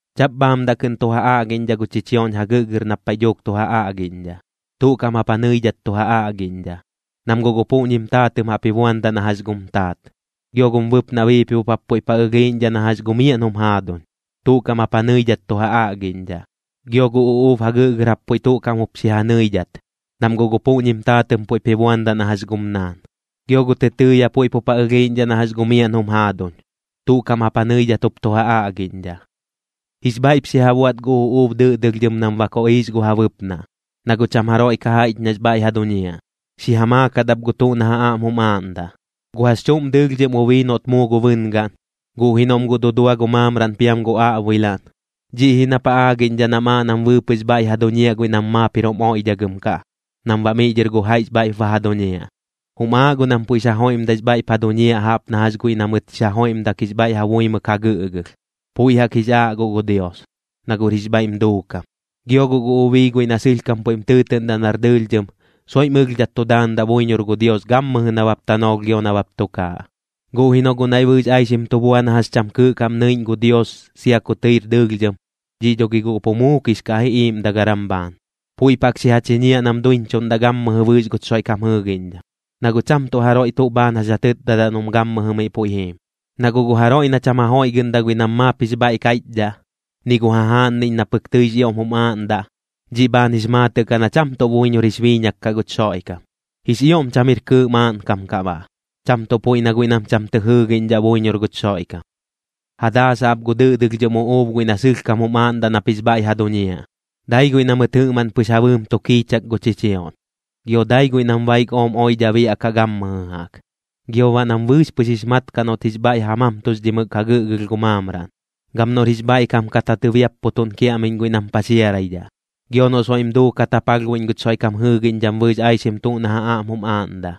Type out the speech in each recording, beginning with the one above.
Chaꞌp bhaamdaꞌ kɨꞌn tu ja aꞌgiꞌñdhaꞌ gu chichioꞌñ jagɨꞌgɨr nap paiꞌ dhuuk tu ja aꞌgiꞌñdhaꞌ. Tuꞌ kaꞌm jap ja nɨidhat tu ja aꞌgiꞌñdhaꞌ, nam guꞌ gu puꞌñim taatɨꞌm jaꞌp ji buandaꞌ na jax gum taat. Gio gum bɨpnaꞌ biipibop jap puiꞌp ja ɨlhiiꞌñdhaꞌ na jax gu miaꞌn jum jaaduñ, tuꞌ kaꞌm jap ja nɨidhat tu ja aꞌgiꞌñdhaꞌ. Gio gu uꞌuub jagɨꞌgɨr jap puiꞌ tuꞌ kaꞌm jup xi ja nɨidhat, nam guꞌ gu puꞌñim taatɨꞌm puiꞌp ji buandaꞌ na jax gum naan. Gio gu tɨtɨɨya puiꞌp jup ja ɨlhiiꞌñdhaꞌ na jax gu miaꞌn jum jaaduñ, tuꞌ kaꞌm jap ja nɨidhat jup tu ja aꞌgiꞌñdhaꞌ. Jix bhaiꞌp xi ja buaꞌt gu uꞌuub dɨꞌdɨlhdhɨm nam ba koꞌiix gu ja bɨpnaꞌ, na guꞌ cham jaroiꞌ ka jaiꞌch nax bhaiꞌ ja duñiaꞌ. Xi ja maakat ap gu tuꞌ na ja aꞌm jum aaꞌndaꞌ. Gu jax chuꞌm dɨɨlhdhɨm ubii noꞌt muu gu bɨngaꞌn, guꞌ ji noꞌm guꞌ dudua gu maamraꞌn piam gu aꞌbuilaꞌn, dhiꞌ ji nap ja aagiꞌñdhaꞌ nam aaꞌ nam bɨɨpɨꞌx bhaiꞌ ja duñiaꞌ guiꞌ nam maap jir jum oiꞌdhagɨm kaꞌ, nam baꞌ miꞌ dhɨr gu jaiꞌx bhaiꞌp ba ja duñiaꞌ. Jum aaꞌ guꞌ nam puiꞌx ja joiꞌmdaix bhaiꞌp ja duñiaꞌ jaꞌp na jax guiꞌ na mɨt jix ja joiꞌmdak jix bhaiꞌ ja buimɨk ja gɨꞌgɨlh, puiꞌ jaꞌk jix aaꞌ guꞌ gu Dios, na guꞌr jix bhaiꞌm duukam. Gio guꞌ gu ubii guiꞌ na sɨlhkam puiꞌm tɨɨtɨꞌndaꞌ nar dɨɨlhdhɨm, soiꞌm ɨlhdhat tu daandaꞌ buiñor gu Dios gammɨjɨ nabap tanoolh gio nabap tukaaꞌ. Guꞌ ji noꞌ guꞌ naiꞌ bɨɨx aixim tu bua na jax cham kɨɨꞌ kaꞌm nɨiꞌñ gu Dios sia ku tɨir dɨɨlhdhɨm, dhiꞌ dho gi guꞌ pu muukix kaꞌ ji iiꞌmdagaram bhaan. Puiꞌp jaꞌk xi ja chiñiaꞌ nam duiñchuꞌndaꞌ gammɨjɨ bɨɨx guch Xoiꞌkam jɨɨgiꞌñdham, na guꞌ cham tuꞌ jaroiꞌ tuꞌ bhaan jax ja tɨtdadaꞌ noꞌm gammɨjɨ miꞌ puiꞌ jiim. Na guꞌ gu jaroiꞌ na cham ja joiꞌgɨꞌndaꞌ guiꞌ nam maap jix bhaiꞌ kaiꞌchdhaꞌ, ni gu jajaaꞌnniꞌñ na pɨk tɨix ioꞌm jum aaꞌndaꞌ, dhiꞌ bhaan jix maatɨꞌ kaꞌ na cham tuꞌ buiñor jix biiñak kaꞌ guch Xoiꞌkam. Jix ioꞌm cham jir kɨɨꞌ maaꞌnkam kaꞌ baꞌ, cham tuꞌ puiꞌ na guiꞌ nam cham tɨ jɨɨgiꞌñdhaꞌ buiñor guch Xoiꞌkam. Ja daasaꞌ ap gu dɨꞌdɨlhdhɨm uꞌuub guiꞌ na sɨlhkam jum aaꞌndaꞌ nap jix bhaiꞌ ja duñiaꞌ. Dai guiꞌ na mɨt jɨꞌmaꞌn pɨx ja bɨɨm tu kiichak gu chichioꞌñ, gio dai guiꞌ nam baik ooꞌm oidhaꞌ biaꞌkaꞌ gammɨjɨ jaꞌk. Gio baꞌ nam bɨɨx pɨx jix mat kaꞌ noꞌt jix bhaiꞌ ja mamtuxdhimɨk ja gɨꞌgɨlh gu maamraꞌn. Gam noꞌr jix bhaiꞌkam kat ja tɨbiapputuꞌn kiaꞌmiꞌñ guiꞌ nam paxiaraidhaꞌ. Gio noꞌ soiꞌm duukat ja palhbuiꞌñ guch Xoiꞌkam jɨɨgiꞌñdham bɨɨx aixim tuꞌ na ja aꞌm jum aaꞌndaꞌ.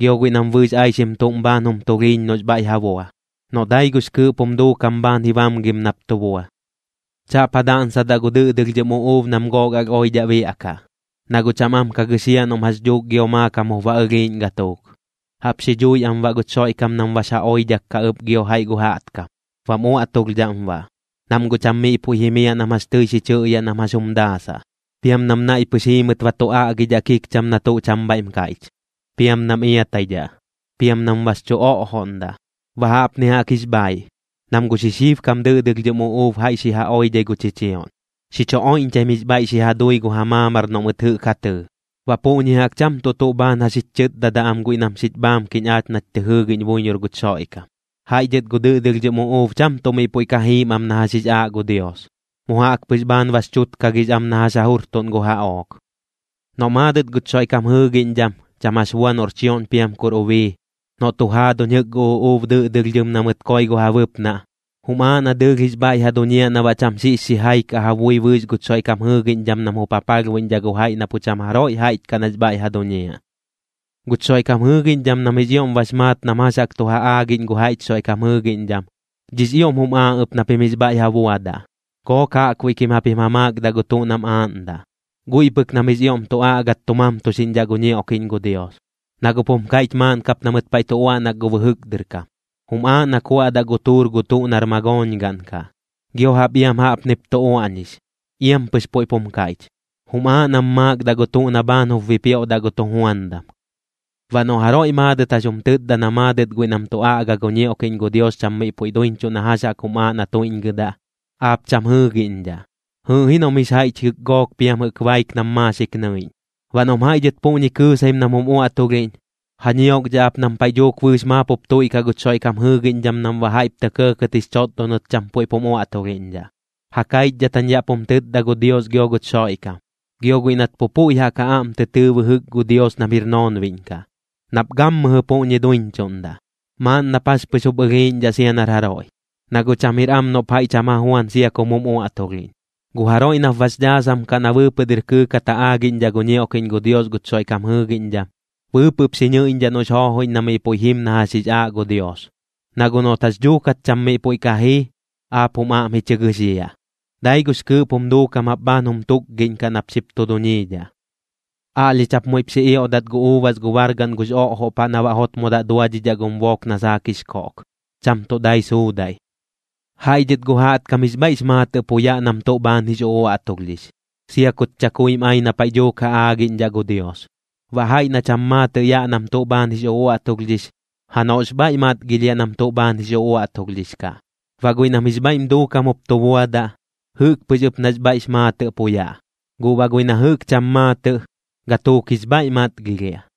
Gio guiꞌ nam bɨɨx aixim tuꞌm bhaan jum tulhiiñ noꞌx bhaiꞌ ja bua, noꞌ dai gux kɨɨꞌp jum duukam bhaan ji bamgim nap tu bua. Chaꞌp ja daꞌnsadaꞌ gu dɨꞌdɨlhdhɨm uꞌuub nam gook alh oidhaꞌ biaꞌkaꞌ, na guꞌ cham am ka gɨxiaꞌ noꞌm jax dhuuk gio maakam jup ba ɨlhiiꞌñ gatuuk. Jaꞌp xi dhui am baꞌ guch Xoiꞌkam nam bax ja oidhak kaꞌ ɨp gio jaiꞌ gu jaꞌtkam, bam uaꞌtulhdhaꞌm baꞌ, nam guꞌ cham miꞌ puiꞌ jimiaꞌ nam jax tɨi xi chɨꞌyaꞌ nam jax jum daasaꞌ. Piam nam naiꞌ pɨx jiimɨt ba tu aꞌgidhaꞌ kikcham na tuꞌ cham bhaiꞌm kaiꞌch, piam nam iataidhaꞌ, piam nam bax chu oꞌjoꞌndaꞌ. Baꞌ jaꞌpni jaꞌk jix bhaiꞌ, nam gu xixibkam dɨꞌdɨlhdhɨm uꞌuub jaiꞌ xi ja oidhai gu chichioꞌñ, xi chu oiꞌñchaim jix bhaiꞌ xi ja dui gu ja maamar noꞌ mɨt jɨꞌk ja tɨɨ. Baꞌ puꞌñi jaꞌk cham tuꞌ tuꞌ bhaan jax jich chɨtdadaꞌ am guiꞌ nam xich bhaamkiꞌñ aach nach tɨ jɨɨgiꞌñ buiñor guch Xoiꞌkam. Jaiꞌ dhɨt gu dɨꞌdɨlhdhɨm uꞌuub cham tuꞌ miꞌ puiꞌ ka jiim am na jax jix aaꞌ gu Dios, mu jaꞌk pɨx bhaan bax chutkagix am na jax ja jurtuꞌn gu jaꞌook. Noꞌ maadɨt guch Xoiꞌkam jɨɨgiꞌñdham, cham jax bua noꞌr chioꞌñ piam kur ubii, noꞌ tu jaaduñ jɨꞌk gu uꞌuub dɨꞌdɨlhdhɨm na mɨt koi gu ja bɨpnaꞌ, jum aaꞌ na dɨɨlh jix bhaiꞌ ja duñiaꞌ na baꞌ cham xiꞌx xijai kaꞌ ja bui bɨɨx guch Xoiꞌkam jɨɨgiꞌñdham nam jup ja palhbuiꞌñdhaꞌ gu jaiꞌ na pu cham jaroiꞌ jaiꞌch kaꞌ nax bhaiꞌ ja duñiaꞌ. Guch Xoiꞌkam jɨɨgiꞌñdham nam jix ioꞌm bax maat nam jax jaꞌk tu ja aagiꞌñ gu jaiꞌch Xoiꞌkam jɨɨgiꞌñdham, dhiꞌx ioꞌm jum aaꞌ ɨp na pim jix bhaiꞌ ja buadaꞌ. Gook jaꞌkbuiꞌ kim japim ja maakdaꞌ gu tuꞌ nam aaꞌndaꞌ, guiꞌ pɨk nam jix ioꞌm tu aꞌgat tu mamtuxiꞌñdhaꞌ gu ñioꞌkiꞌñ gu Dios. Na guꞌp jum kaiꞌch maaꞌn kap na mɨt paiꞌ tu uaꞌnak gu bɨjɨk dɨr kam: “Jum aaꞌ na kuaꞌdaꞌ gu tuur gu tuꞌ nar magooñgaꞌn kaꞌ.” Gio jaꞌp iam jaꞌpnip tu uaꞌñix, iam pɨx puiꞌp jum kaiꞌch: “Jum aaꞌ nam maakdaꞌ gu tuꞌ na bhaan jup bipioꞌdaꞌ gu tujuandam.” Baꞌ noꞌ jaroiꞌ maadɨt jax jum tɨtda na maadɨt guiꞌ nam tu aꞌga gu ñioꞌkiꞌñ gu Dios cham miꞌ puiꞌ duiñchuꞌ na jax jaꞌk jum aaꞌ na tuiꞌñgɨdaꞌ, aap cham jɨɨgiꞌñdhaꞌ. Jɨɨꞌ ji noꞌm jix jaiꞌch jɨꞌk gook piam jɨꞌk baik nam maaxik nɨiꞌñ. Baꞌ noꞌm jaiꞌ dhɨt puꞌñi kɨɨsaim nam jum uaꞌtulhiꞌñ, ja ñiokdhaꞌ ap nam paiꞌ dhuuk bɨɨx maap jup tuiꞌkaꞌ guch Xoiꞌkam jɨɨgiꞌñdham nam baꞌ jaiꞌp tɇ kɇɇkɇt jix chotdonɨt cham puiꞌp jum uaꞌtulhiꞌñdhaꞌ. Ja kaichdhat jañ yaꞌ pum tɨtda gu Dios gio guch Xoiꞌkam, gio guiꞌ nat pu puiꞌ jaꞌk ja aꞌm tɨ tɨɨ bɨjɨk gu Dios nam jir noonbiꞌñ kaꞌ, nap gammɨjɨ puꞌñi duiñchuꞌndaꞌ. Maaꞌn nap jax pɨx jup ɨlhiiꞌñdhaꞌ sia nar jaroiꞌ, na guꞌ cham jir am noꞌp jaiꞌ cham ja juan sia kum jum uaꞌtulhiꞌñ. Gu jaroiꞌ nap bax dhaasam kaꞌ na bɨɨpɨꞌ dɨr kɨɨkat ja aagiꞌñdhaꞌ gu ñioꞌkiꞌñ gu Dios guch Xoiꞌkam jɨɨgiꞌñdham, bɨɨpɨꞌp xi nɨiꞌñdhaꞌ noꞌx joojoiꞌñ na miꞌ puiꞌ jim na jax jix aaꞌ gu Dios. Na guꞌ noꞌt jax dhuukat cham miꞌ puiꞌ ka jii, aap jum aꞌm ji chɨ gɨxiaꞌ. Dai gux kɨɨꞌp jum duukam jap bhaan jum tukgiꞌñkaꞌ nap xip tu duñiidhaꞌ. Aꞌlhich jap muiꞌp xi ioꞌdat gu uubas gu bargaꞌn gux oꞌjoꞌ paꞌ na baꞌ jotmodaꞌ duadhidhaꞌ gum book na saak jix koꞌk, cham tuꞌ dai suudaiꞌ. Jaiꞌ dhɨt gu jaꞌtkam jix bhaiꞌx maatɨꞌ pu yaꞌ nam tuꞌ bhaan jix uꞌuaꞌtulhdhix, sia kut chakuim ai na paiꞌ dhuuk ja aagiꞌñdhaꞌ gu Dios. Baꞌ jaiꞌ na cham maatɨꞌ yaꞌ nam tuꞌ bhaan jix uꞌuaꞌtulhdhix, janoꞌx bhaiꞌ matgilhiaꞌ nam tuꞌ bhaan jix uꞌuaꞌtulhdhix kaꞌ. Baꞌ guiꞌ nam jix bhaiꞌm duukam jup tu buadaꞌ, jɨꞌk pɨx ɨp nax bhaiꞌx maatɨꞌ pu yaꞌ, guꞌ baꞌ guiꞌ na jɨꞌk cham maatɨꞌ, gatuuk jix bhaiꞌ matgilhiaꞌ.